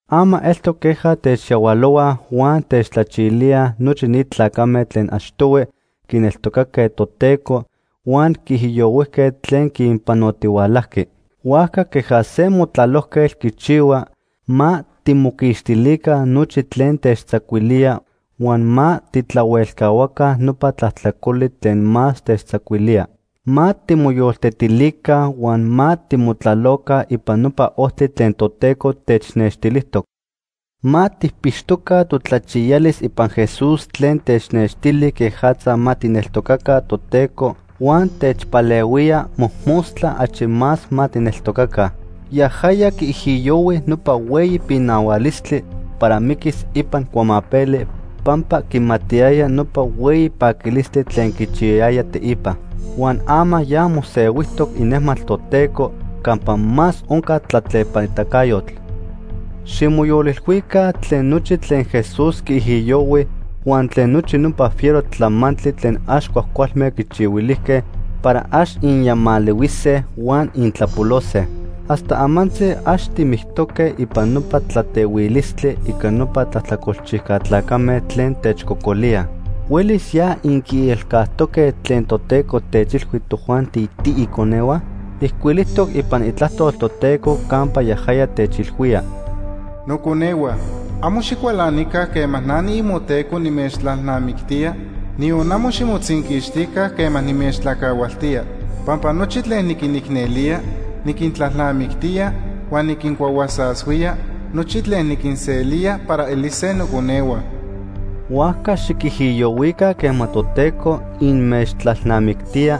Ama eltoc queja techyahualohuaj huan techtlachilíaj nochi ni tlacame tlen achtohui quineltocaque Toteco huan quiijiyohuijque tlen quinpanotihualajqui. Huajca queja se motlalojquetl quichihua, ma timoquixtilica nochi tlen techtzacuilía huan ma tijtlahuelcahuaca nopa tlajtlacoli tlen más techtzacuilía. Ma timoyoltetilica huan ma timotlaloca ipan nopa ojtli tlen Toteco technextilijtoc. Ma tijpixtoca totlachiyalis ipan Jesús tlen technextili quejatza ma tijneltocaca Toteco huan techpalehuía mojmostla achi más ma tijneltocaca. Yajaya quiijiyohui nopa hueyi pinahualistli para miquis ipan cuamapeli pampa quimatiyaya nopa hueyi paquilistli tlen quichiyayaya teipa. Huan ama ya mosehuijtoc inejmatl Toteco campa más onca tlatlepanitacayotl. Ximoyolilhuica tlen nochi tlen Jesús quiijiyohui huan tlen nochi nopa fiero tlamantli tlen ax cuajcualme quichihuilijque para ax inyamalihuise huan intlapolose. Hasta amantzi ax timictoque ipan nopa tlatehuilistli ica nopa tlajtlacolchijca tlacame tlen techcocolíaj. ¿Huelis ya inquiilcajtoque tlen Toteco techilhui tojuanti tiiconehua? Ijcuilijtoc ipan Itlajtol Toteco campa yajaya techilhuía: “Noconehua, amo xicualanica quema na niimoTeco nimechtlalnamictía, niyon amo ximotzinquixtica quema nimechtlacahualtía. Pampa nochi tlen niquinicnelía, niquintlalnamictía, huan niquincuahuasashuía nochi tlen niquinselía para elise noconehua.” Huajca xiquijiyohuica quema Toteco inmechtlalnamictía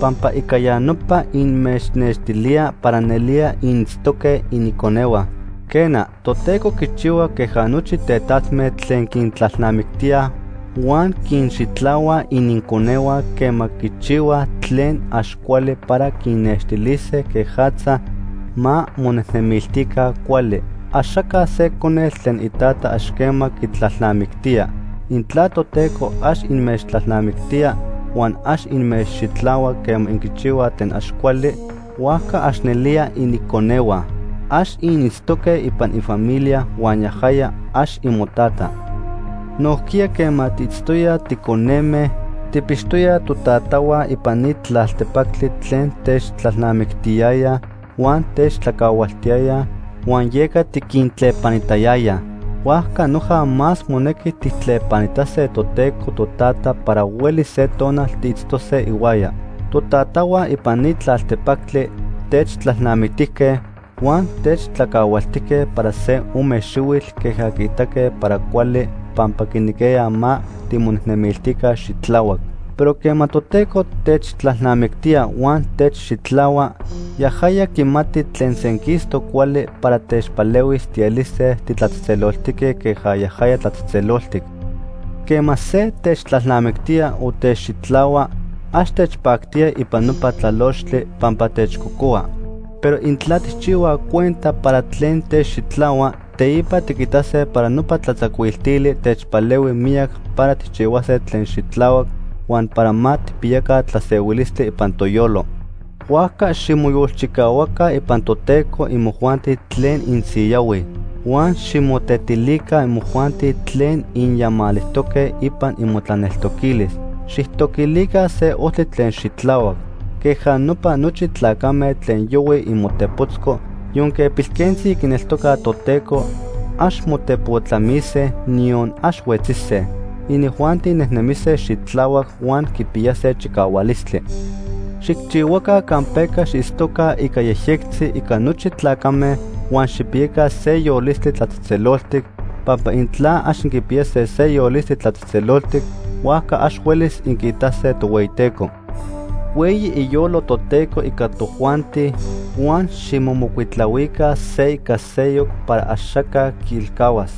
pampa ica ya nopa inmechnextilía para nelía initztoque iniconehua. Quena, Toteco quichihua queja nochi tetatme tlen quintlalnamictíaj huan quinxitlahuaj ininconehua quema quichihuaj tlen ax cuali para quinnextilise quejatza ma monejnemiltica cuali. Axaca se conetl tlen itata ax quema quitlalnamictía. Intla Toteco ax inmechtlalnamictía huan ax inmechxitlahua quema inquichihuaj tlen ax cuali, huajca ax nelía iniconehua. Ax initztoque ipan ifamilia huan yajaya ax imoTata. Nojquiya quema tiitztoyaj ticoneme, tijpixtoyaj totatahua ipan ni tlaltepactli tlen techtlalnamictiyayaj huan techtlacahualtiyayaj huan yeca tiquintlepanitayayaj. Huajca noja más monequi tijtlepanitase Toteco Totata para huelis se tonal tiitztose ihuaya. Totatahua ipan ni tlaltepactli techtlalnamictijque huan techtlacahualtijque para se ome xihuitl queja quiitaque para cuali pampa quinequiyayaj ma timonejnemiltica xitlahuac. Pero quema Toteco techtlalnamictía huan techxitlahua, yajaya quimati tlen senquistoc cuali para techpalehuis tielise titlatzejtzeloltique queja yajaya tlatzejtzeloltic. Quema se techtlalnamictía o techxitlahua, ax techpactía ipan nopa tlalochtli, pampa techcocohua. Pero intla tijchihuaj cuenta para tlen techxitlahua, teipa tiquitase para nopa tlatzacuiltili techpalehui miyac para tijchihuase tlen xitlahuac huan para ma tijpiyaca tlasehuilistli ipan toyolo. Huajca ximoyolchicahuaca ipan Toteco imojuanti tlen insiyahuij. Huan ximotetilica imojuanti tlen inyamalijtoque ipan imotlaneltoquilis. Xijtoquilica se ojtli tlen xitlahuac. Queja nopa, nochi tlacame tlen yohuij imotepotzco yonque pilquentzi quineltocaj Toteco, ax motepotlamise, niyon ax huetzise. Inijuanti nejnemise xitlahuac huan quipiyase chicahualistli. Xijchihuaca campeca xiitztoca ica yejyectzi ica nochi tlacame huan xijpiyaca se yolistli tlatzejtzeloltic, pampa intla ax inquipiyase se yolistli tlatzejtzeloltic, huajca ax huelis inquiitase Tohueyiteco. Hueyi iyolo Toteco ica tojuanti huan ximomocuitlahuica se ica seyoc para axaca quiilcahuas.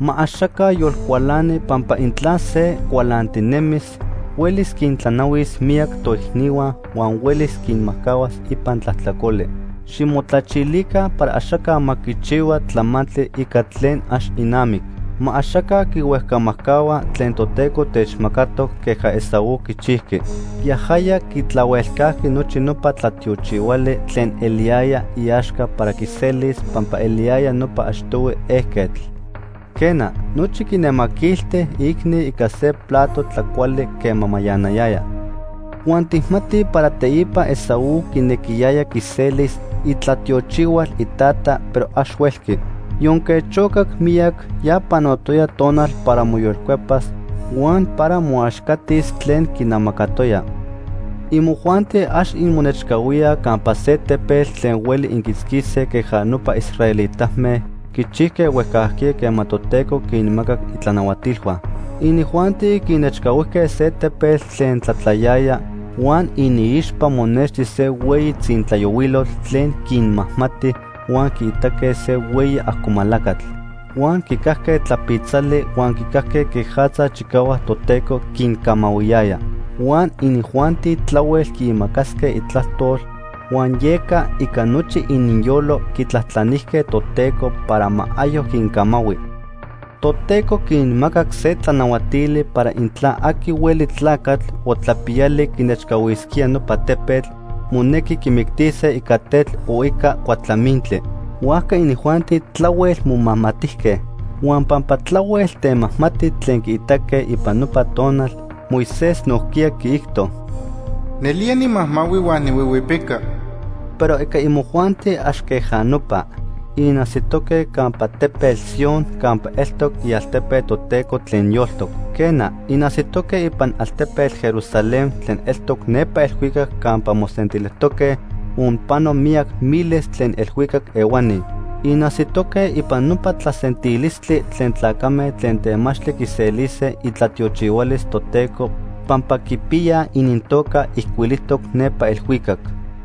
Ma axaca yolcualani pampa intla se cualantinemis, huelis quintlanahuis miyac toicnihua huan huelis quinmajcahuas ipan tlajtlacoli. Ximotlachilica para axaca ma quichihua tlamantli ica tlen ax inamic. Ma axaca quihuejcamajcahua tlen Toteco techmacatoc queja Esaú quichijqui. Yajaya quitlahuelcajqui nochi nopa tlatiochihuali tlen eliyaya iaxca para quiselis pampa eliyaya nopa achtohui ejquetl. Quena, nochi quinemaquilti iicni ica se plato tlacuali quema mayanayaya. Huan tijmatij para teipa Esaú quinequiyaya quiselis itlatiochihual itata, pero ax huelqui. Yonque chocac miyac, ya panotoya tonal para moyolcuepas huan para moaxcatis tlen quinamacatoya. Imojuanti ax inmonechcahuíaj campa se tepetl tlen hueli inquiitzquise queja nopa israelitame quichijque huejcajquiya quema Toteco quinmacac itlanahuatilhua. Inijuanti quinechcahuijque se tepetl tlen tlatlayaya, huan iniixpa monexti se hueyi tzintlayohuilotl tlen quinmajmati, huan quiitaque se hueyi ajcomalacatl. Huan quicajque tlapitzali huan quicajque quejatza chicahuac Toteco quincamahuiyaya. Huan inijuanti tlahuel quiimacasque itlajtol huan yeca ica nochi ininyolo quitlajtlanijque Toteco para ma ayoc quincamahui. Toteco quinmacac se tlanahuatili para intla aqui hueli tlacatl o tlapiyali quinechcahuisquía nopa tepetl, monequi quimictise ica tetl o ica cuatlamintli. Huajca inijuanti tlahuel momajmatijque. Huan pampa tlahuel temajmati tlen quiitaque ipan nopa tonal, Moisés nojquiya quiijto: “Nelía nimajmahui huan nihuihuipica.” Pero ica imojuanti ax queja nopa. Inajsitoque campa tepetl Sion campa eltoc ialtepe Toteco tlen yoltoc. Quena, inajsitoque ipan altepetl Jerusalén tlen eltoc nepa elhuicac campa mosentilijtoque onpano miyac miles tlen elhuicac ehuani. Inajsitoque ipan nopa tlasentilistli tlen tlacame tlen temachtli quiselise itlatiochihualis Toteco pampa quipiyaj inintoca ijcuilijtoc nepa elhuicac.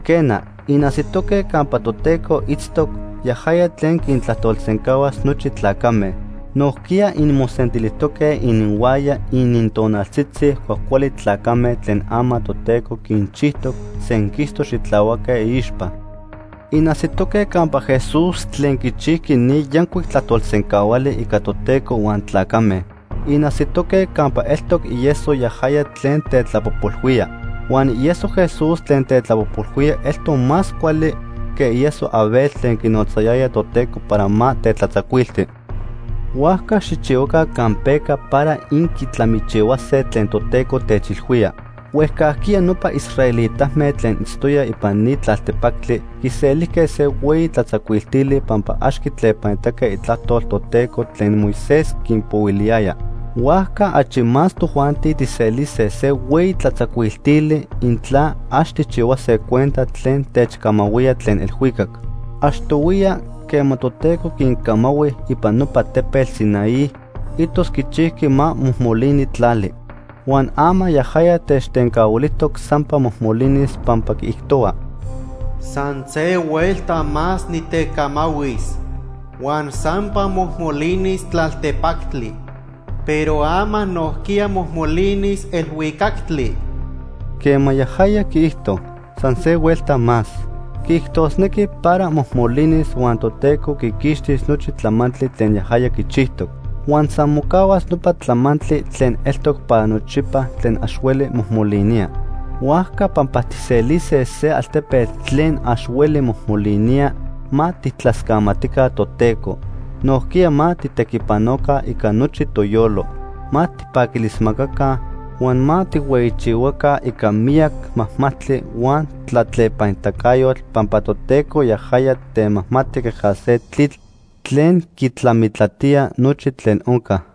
Quena, inajsitoque campa Toteco itztoc, yajaya tlen quintlajtolsencahuas nochi tlacame. Nojquiya inmosentilijtoque ininhuaya inintonaltzitzi cuajcuali tlacame tlen ama Toteco quinchijtoc senquistoc xitlahuaque iixpa. Inajsitoque campa Jesús tlen quichijqui ni yancuic tlajtolsencahuali ica Toteco huan tlacame. Inajsitoque campa eltoc ieso yajaya tlen tetlapojpolhuía. Huan ieso Jesús tlen tetlapojpolhuía eltoc más cuali que ieso Abel tlen quinotzayaya Toteco para ma tetlatzacuilti. Huajca xijchihuaca campeca para inquitlamichihuase tlen Toteco techilhuía. Huejcajquiya nopa israelitame tlen itztoyaj ipan ni tlaltepactli quiselijque se hueyi tlatzacuiltili pampa ax quitlepanitaque itlajtol Toteco tlen Moisés quinpohuiliyaya. Huajca achi más tojuanti tijselise se hueyi tlatzacuiltili intla ax tijchihuase cuenta tlen techcamahuía tlen elhuicac. Achtohuiya, quema Toteco quincamahui ipan nopa tepetl Sinaí, itos quichijqui ma mojmolini tlali. Huan ama yajaya techtencahuilijtoc sampa mojmolinis pampa quiijtohua: “San se huelta más nitecamahuis, huan sampa mojmolinis tlaltepactli. Pero ama nojquiya mojmolinis elhuicactli.” Quema yajaya quiijto: “San se huelta más”, quiijtosnequi para mojmolinis huan Toteco quiquixtis nochi tlamantli tlen yajaya quichijtoc. Huan san mocahuas nopa tlamantli tlen eltoc para nochipa tlen ax hueli mojmolinía. Huajca pampa tijselise se altepetl tlen ax hueli mojmolinía, ma tijtlascamatica Toteco. Nojquiya ma tijtequipanoca ica nochi toyolo, ma tijpaquilismacaca huan ma tijhueyichihuaca ica miyac majmajtli huan tlatlepanitacayotl, pampa Toteco yajaya temajmati queja se tlitl tlen quitlamitlatía nochi tlen onca.